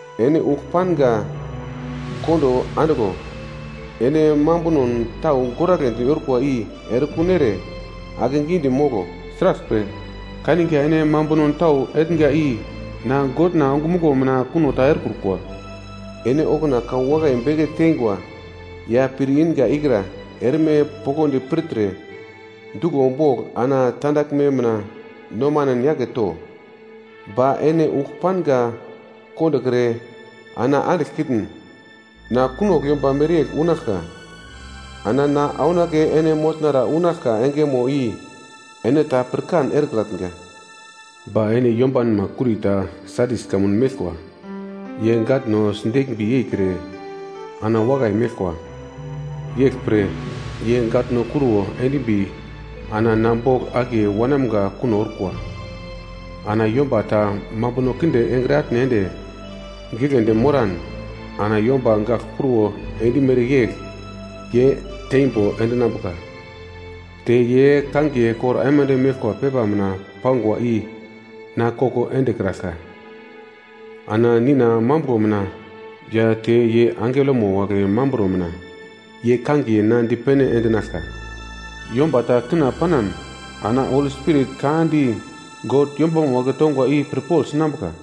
Ene ugl panga kondo andiglo. Ene mambunon tau goragledi orkwa i erekun ere akegidi moglo. Sraglpre, kaniga ene mambuno tau etnga i na Godna ongumuglo mina kuno ta erekrukwa. Ene okuna ka wakai beke tengwa ya pir inga ikra erme poglodi pirtre, duglo bogl ana tandaglme mina nomanen yake to. Ba ene ugl panga kondokre ana andiglkitn, na kunogl yomba mereyegl unaglka, ana na aunake ene motnara unaglka engemo i ene ta pirkan erekratnga. Ba ene yombanma kurita Sadis kamun meglkwa, ye gatno sideglmbi yeikre ana wakai meglkwa. Yeglpre ye gatno kruwo endimbi ana na bogl akiye wanamga kuno orkwa. Ana yomba ta mambuno kinde engre atne ende giglendi moran ana yomba gagl kruwo endimere yegl ye teimbo endinambuka. Te ye kangiye kor aimande meglkwa pepa mina pangwa i na koko endekraglka. Ana Nina mambuglo mina ya te ye angelomo wagle mamburo mina ye kangiye na dipene endinaglka. Yomba ta kina panan ana Holi Spirit ka di God yombama wagle tongwa i pirpogl sinambuka.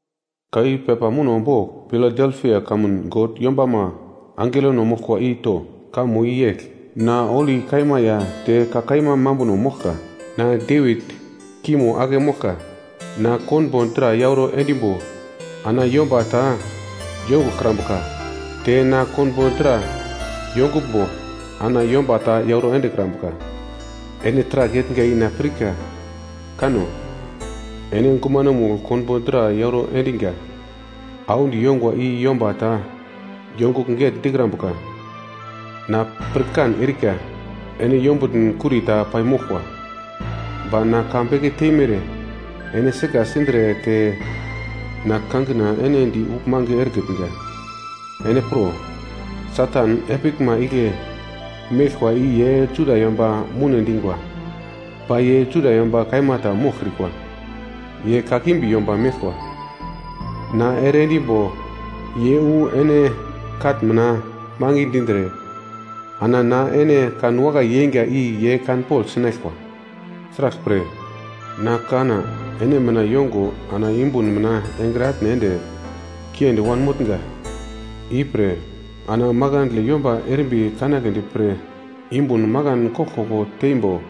“Ka i pepa muno bogl Piladelpia kamun God yombama angelono moglkwa i to. Kamo i yegl: Na holi kaima ya te ka kaima mambuno moglka. Na Devit kimo ake moglka, na konbo dra yauro endimbo ana yomba ta yonguglkrambuka, te na konbo dra yonguglmbo ana yomba ta yauro endekrambuka. Ene taragl etnga i na pirka. Kano! Ene gumanomugl konbo dra yauro endiga audi yongwa i yomba ta yongugl getndikrambuka. Na pirkan erika ene yombutn kurita paimoglkwa. Ba na ka beke teimere ene sika sindre te na kangina ene di uglmange erekitnga. Ene pro! Satan epiglma igle meglkwa i ye Juda yomba moune dingwa, ba ye Juda yomba kaima ta moglkrikwa, ye kakimbi yomba meglkwa. Na ere endimbo ye wu ene katn mina mangi dindre ana na ene kanwakai yeinga i ye kanpogl sinaglkwa. Sraglpre, na kanna ene mina yongo ana yumbun mina engre atne ende kiendi wanmotnga. Ipre, ana makandle yomba erimbi kanagledi pre yumbun makan koglkoglo teimbo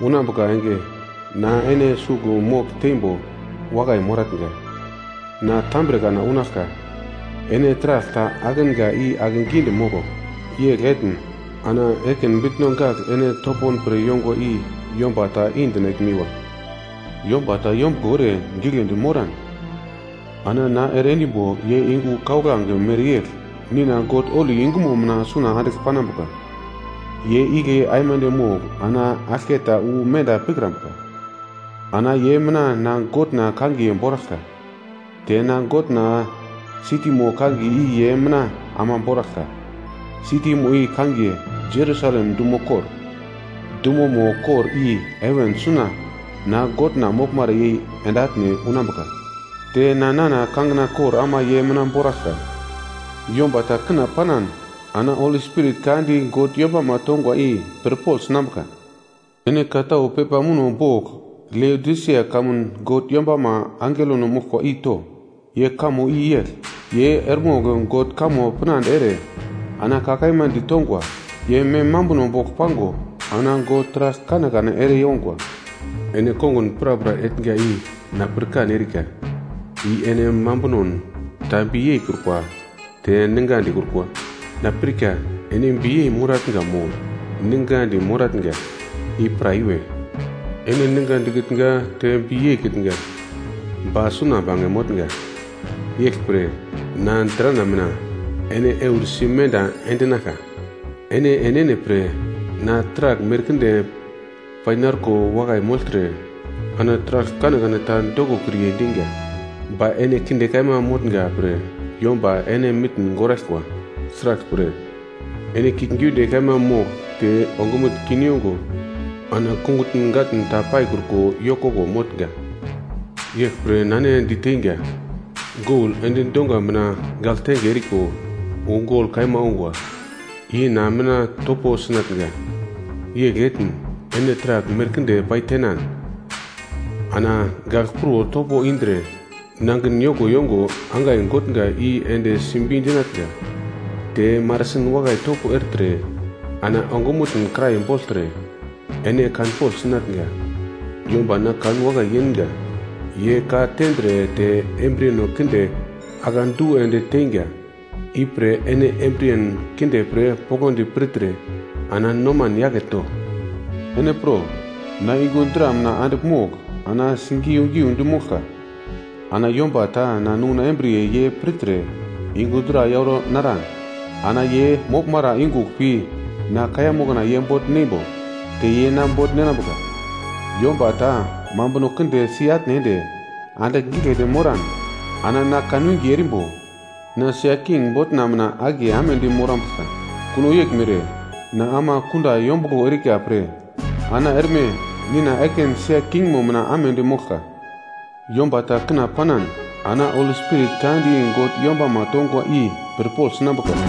unambuka enge na ene sugl mogl teimbo wakai moratnga. Na tambre kana unaglka, ene taragl ta idiom i akegidi moglo. Yegl etn ana ekin bitno gagl ene topon pre yongwa i yomba ta i-dinaglmiwa. Yomba ta yombuglo ere giglendi moran ana na ere endimbo ye yungu kauglange mereyegl Nina God holi yungumo mina suna andigl panambuka. Ye igle aimande mogl ana aglketa wu menda pikrambuka. Ana ye mina na Godna kangiye boraglka, te na Godna sitimo kangiye i ye mina ama boraglka. Sitimo i kangiye Jerusalem dumo kor. Dumomo kor i heven suna na Godna moglmara yei ende atne unambuka. Te na nana kangina kor ama ye mina boraglka. Yomba ta kina panan ana Holi Spirit ka di God yombama tongwa i pirpogl sinambuka. “Ene ka tau pepa muno bogl Leodisia kamun God yombama angelono moglkwa i to. Ye kamo i yegl: Ye eremogl God kamo pinande ere ana ka kaima ditongwa, ye mem mambuno bogl pango ana God taragl kanekane ere yongwa. Ene kongun prapra etnga i na pirkan erika, i ene mambunon ta bi yeikrukwa te ninga dikrukwa. Na pirka ene biyei moratnga mo ningadi moratnga i pra iwe. Ene ninga dikitnga te bi yeikitnga ba suna bange motnga. Yeglpre na drana mina ene eursi menda endinaglka. Ene enene pre, na taragl merkinde painarko wakai mogltre ana taragl kanekane ta dokokriye dinga. Ba ene kinde kaima motnga pre yomba ene mitn goraglkwa. Sraglpre, ene kiuglgiunde kaima mogl te ongumutn kin yongo ana kungutn gatn ta paikruko yokoko motnga. Yeglpre na ene diteinga, gol endi dongwa mina gagltenge eriko wu gol kaima ongwa i na mina topo sinatnga. Yegl etn ene taragl merkinde paitenan ana gagl kruwo topo indre nangin yoko yongo angai gotnga i ende simbi dinatnga. Te marasin wakai topo ertre ana ongumutn kirai bogltre ene kanpogl sinatnga. Yomba na kanwakai yeinga ye ka tendre te embriyeno kinde akedu ende teinga. Ipre ene embriyen kinde pre poglodi pirtre ana noman yake to. Ene pro! Na yungu dra mina andigl mogl ana sigiu-giudi moglka. Ana yomba ta na nunguna embriye ye pirtre yungu dra yauro naran ana ye moglmara yungugl pi na kaiya mokna ye bogl neimbo, te ye na bogl ninambuka. Yomba ta mambuno kinde si-atne ende andigl giglendi moran ana na kanwinge erimbo na sia king botna mina akiye amedi morambuglka. Kuno yeglmere na ama kunda yombuglo erika pre ana erme Nina ekin sia kingmo mina amedi moglka. Yomba ta kina panan ana Holi Spirit ka di God yombama tongwa i pirpogl sinambuka.”